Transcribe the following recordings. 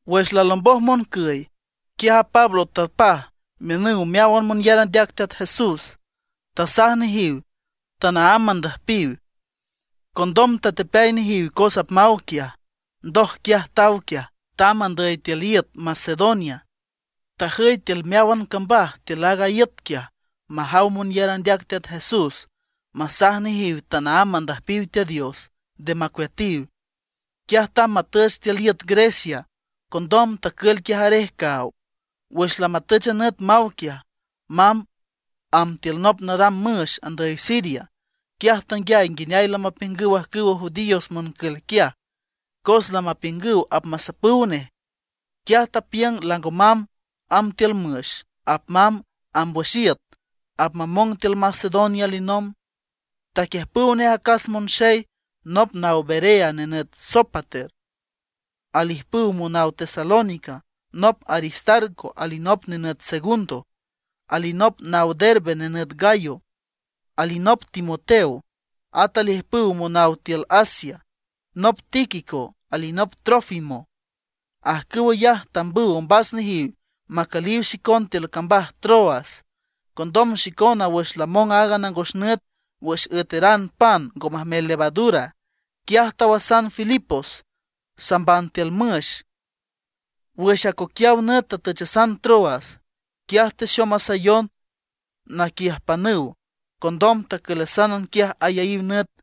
Wüx lalomboj moncüy, quiaj a Pablo tapaj miünüw meáwan monyar andeac Teat Jesús; tasaj nejiw tanaámb mandüjpiw. Condom tatepeay nejiw cos apmaw quiaj. Ndoj quiaj taw quiaj, tamb andüy tiül iüt Macedonia. Tajüy tiül meáwan cambaj tiül aaga iüt quiaj majaw monyar andeac Teat Jesús, masaj nejiw tanaámb mandüjpiw Teat Dios, nde macueatiw. Quiaj tamb matüch tiül iüt Grecia. Condom tacül quiaj arej caaw. Wüx lamatüch a nüt maw quiaj, mamb amb tiül nop nadam müx andüy Siria, quiaj tanguiay nguineay lamapiüngüw ajcüwa judíos moncül quiaj, cos lamapiüngüw apmasapüw nej. Quiaj tapiüng lango mamb amb tiül müx, apmamb amb wüx iüt, apmamong tiül Macedonia alinomb. Taquiüjpüw nej acas monxey: nop naw Berea nenüt Sópater; alijpüw monaw Tesalónica, nop Aristarco, alinop nenüt Segundo; alinop naw Derbe nenüt Gayo; alinop Timoteo; at alijpüw monaw tiül Asia, nop Tíquico alinop Trófimo. Ajcüw ayaj tambüw ombas nejiw macüliw xicon tiül cambaj Troas. Condom xicona wüx lamong aaga nangos nüt wüx üeteran pan ngo majmel levadura, quiaj tawasan Filipos, samban tiül müx. Wüx acoquiaw nüt tatüchasan Troas. Quiaj texomasayon naquiüjpanüw. Condom tacülasan quiaj ayaíw nüt.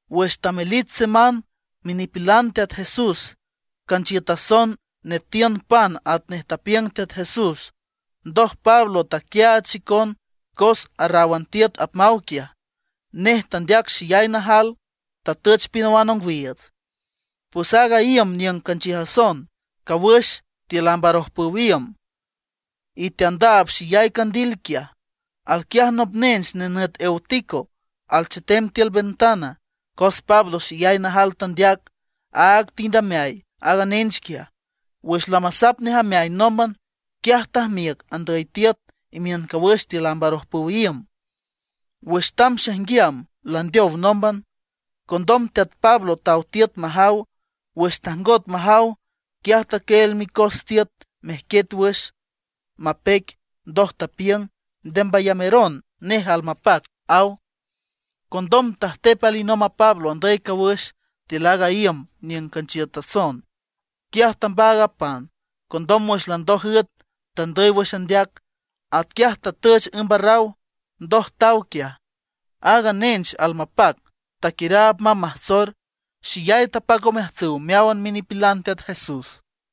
Wüx tamelich semán, minipilan Teat Jesús canchiütason nüetiün pan atnej tapiüng Teat Jesús. Ndoj Pablo taquiaach xicon cos arraw tiüt apmaw quiaj. Nej tandeac xeyay najal, tatüch pinawan ongwiiüts. Pues aaga iüm niüng canchiütason, cawüx tiül amb arojpüw iüm, y teandaab xeyay candil quiaj. Alquiaj nop nench nenüt Eutico, alchetem tiül ventan. Cos Pablo xeyay najal tandeac, áag tind ameay aaga nench quiaj. Wüx lamasap nej ameay nómban, quiaj tajmiüc andüy tiüt imiün cawüx tiül amb arojpüw iüm. Wüx tamb xaijnguiam, landeow nómban. Condom teat Pablo taw tiüt majaw. Wüx tajngot majaw, quiaj taquieel micos tiüt mejquiet wüx, mapeic. Ndoj tapiüng: ―Nde mbayameron, nej almapac ―aw. Condom tajtep alinomb a Pablo andüy cawüx tiül aaga iüm niüng canchiütason, quiaj tambaag a pan. Condom wüx landoj üet, tandüy wüx andeac; atquiaj tatüch ümb arraw. Ndoj taw quiaj. Aaga nench almapac, taquiüraab mamb majtsor, xeyay tapac omeajtsüw meáwan minipilan Teat Jesús.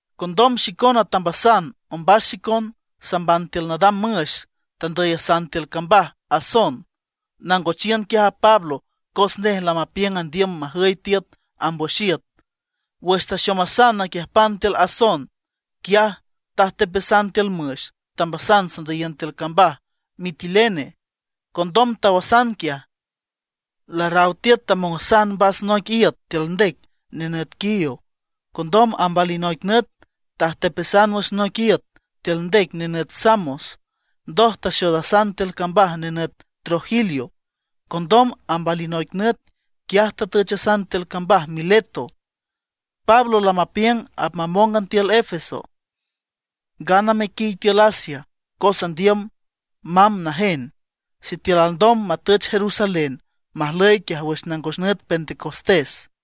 Condom xicona tambasan ombas xicon, samban tiül nadam müx, tandüyasan tiül cambaj Asón, nangochiün quiaj a Pablo. Cos nej lamapiüng andiüm majüy tiüt amb wüx iüt. Wüx texomasayon naquiüjpan tiül Asón, quiaj tajtepasan tiül müx, tambasan sandüyiün tiül cambaj Mitilene. Condom tawasan quiaj. Larraw tiüt tamongasan mbas noic iüt tiül ndec nenüt Quío. Condom amb alinoic nüt tajtepasan wüx noic iüt tiül ndec nenüt Samos, ndoj taxoodasan tiül cambaj nenüt Trogilio. Condom amb alinoic nüt, quiaj tatüchasan tiül cambaj Mileto. Pablo lamapiüng apmamóngan tiül Éfeso, ngana mequiy tiül Asia. Cos andiüm mamb najen, sitiül alndom matüch Jerusalén, majlüy quiaj wüx nangos nüt Pentecostés.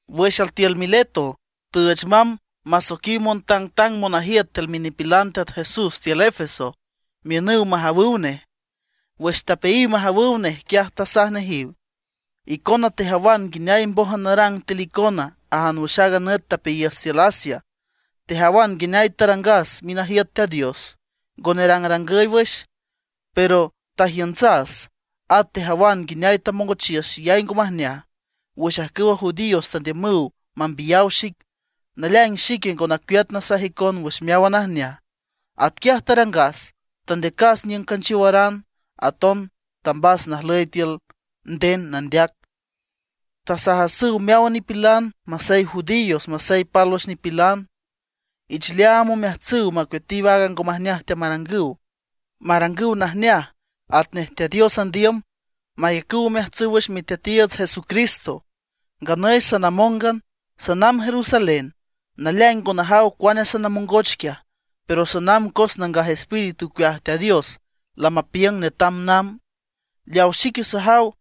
Wüx altiül Mileto, tüüch mamb masoiquiw montangtang monajiüt tiül minipilan Teat Jesús tiül Éfeso miünüw majawüw nej. Wüx tapeayiw majawüw nej, quiaj tasaj nejiw: ―Icona tejawan nguineay mbójan narang tiül icona ajan wüx aaga nüt tapeayiüs tiül Asia. Tejawan nguineay tarangas minajiüt Teat Dios, ngo nerangrangüy wüx, pero tajiüntsas. At tejawan nguineay tamongochiüs xeyay ngo majneaj wüx ajcüwa judíos tandiümüw mambiyaw xic. Naleaing xique ngo nacueat nasaj icon wüx meáwan najneaj. Atquiaj tarangas, tandeacas niüng canchiowaran, aton tambas najüy tiül nden nandeac. Tasajasüw meáwan nipilan, masey judíos, masey pálwüx nipilan, ich leaam omeajtsüw macueatiw aaga ngo majneaj teamarangüw, marangüw najneaj atnej Teat Dios andiüm, mayacüw omeajtsüw wüx Miteatiiüts Jesucristo. Nganüy sanamóngan, sanamb Jerusalén. Naleaing ngo najaw cuane sanamongoch quiaj. Pero sanamb cos Nangaj Espíritu ocueaj Teat Dios lamapiüng netam namb. Leaw xique sajaw,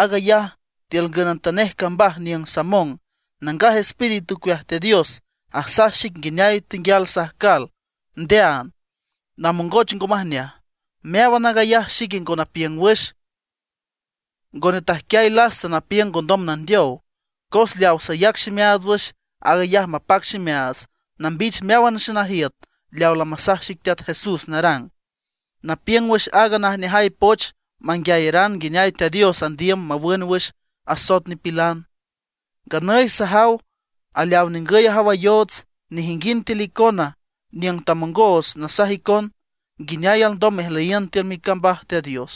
aag ayaj tiül ngünantanej cambaj niüng samong, Nangaj Espíritu ocueaj Teat Dios asaj xic nguineay tenguial sajcal ndeaand, namongoch ngo majneaj. Meáwan aag ayaj, xique ngo napiüng wüx, ngo netajquiay lasta napiüng ngondom nandeow. Cos leaw sayac ximeaats wüx, aag ayaj mapac ximeaats nambich meáwan xenajiüt leaw lamasaj xic Teat Jesús narang, napiüng wüx aaga najneajay poch manguiayeran nguineay Teat Dios andiüm mawün wüx asoet nipilan. ’Nganüy sajaw aleaw ningüy ajawayoots; nejinguind tiül icona niüng tamongos nasaj icon nguineay alndom mejlüyiün tiül micambaj Teat Dios,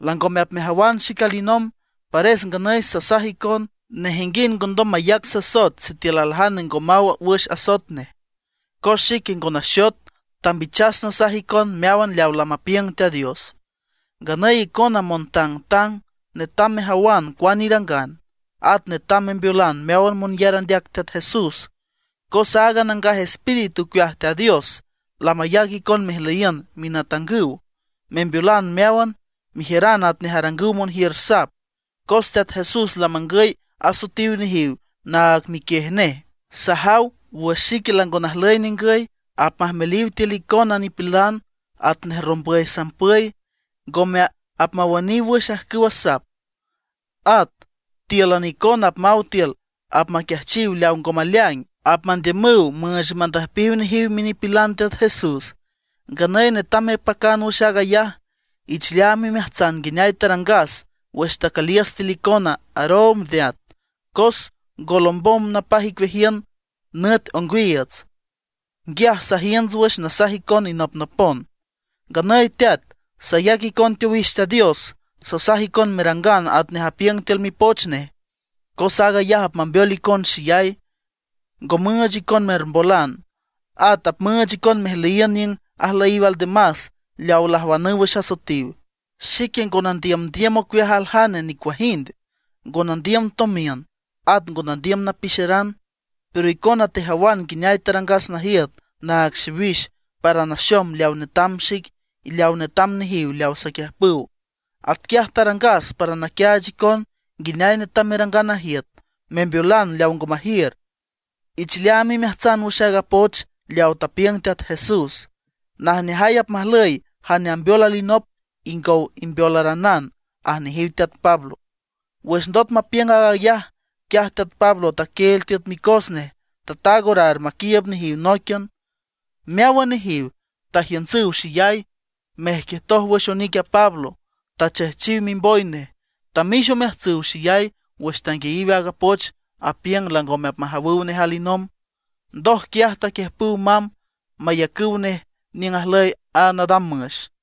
langome apmejawan xic alinomb. Pares nganüy sasaj icon, nejinguind ngondom mayac sasoet sitiül aljane ngo maw wüx asoet nej; cos xique ngo naxot, tambichas nasaj icon meáwan leaw lamapiüng Teat Dios. Nganüy icona montangtang, netam mejawan cuane irangan; at netam membeolan meáwan monyar andeac Teat Jesús. Cos aaga Nangaj Espíritu ocueaj Teat Dios lamayac icon mejlüyiün minatangüw, membeolan meáwan, mejiüranüw atnej arangüw monjiür sap; cos Teat Jesús lamangüy asoetiw nejiw naag miquiej nej. Sajaw wüx xique lango najlüy ningüy, apmajmeliw tiül icona nipilan atnej rombüy sampüy; ngome apmawüniw wüx ajcüwa sap. At tíülan icona apmaw altiül apmaquiajchiw leaw ngo maleaing; apmandiümüw müüch mandüjpiw nejiw minipilan Teat Jesús. Nganüy netam mepacan wüx aag ayaj. Ich leaam imeajtsan nguineay tarangas wüx tacüliüs tiül icona aroomb neat, cos ngo lombom napaj icueajiün nüt ongwiiüts, nguiaj sajiünts wüx nasaj icon inopnopon. ’Nganüy teat, sayac icon teowix Teat Dios. Sasaj icon merangan atnej apiüng tiül Mipoch nej, cos aag ayaj apmambeol icon xeyay, ngo müüch icon mermbolan. At apmüüch icon mejlüyiün niüng ajlüyiw aldemas leawa lajwanüw wüx asoetiw. Xique ngo nandiümdiüm ocueaj aljane nicuajind, ngo nandiüm tomiün at ngo nandiüm napixeran; pero icona tejawan nguineay tarangas najiüt naag xiwix para naxom leaw netam xic y leaw netam nejiw leaw saquiüjpüw. Atquiaj tarangas para naquiaach icon nguineay netam merangan najiüt, membeolan leaw ngo majiür. Ich leaam imeajtsan wüx aaga poch leaw tapiüng Teat Jesús: “Najneajay apmajlüy jane ambeol alinop ingow imbeolaranan” ―aj nejiw teat Pablo. Wüx ndot mapiüng aag ayaj, quiaj teat Pablo taquieel tiüt micos nej, tataag orar maquiiüb nejiw nóiquian. Meáwan nejiw tajiüntsüw xeyay, mejquietoj wüx onic a Pablo, y tachejchiw mimboy nej. Tamix omeajtsüw xeyay wüx tanguiayiw aaga poch apiüng langome apmajawüw nej alinomb. Ndoj quiaj taquiüjpüw mamb mayacüw nej niüng ajlüy a nadam müx.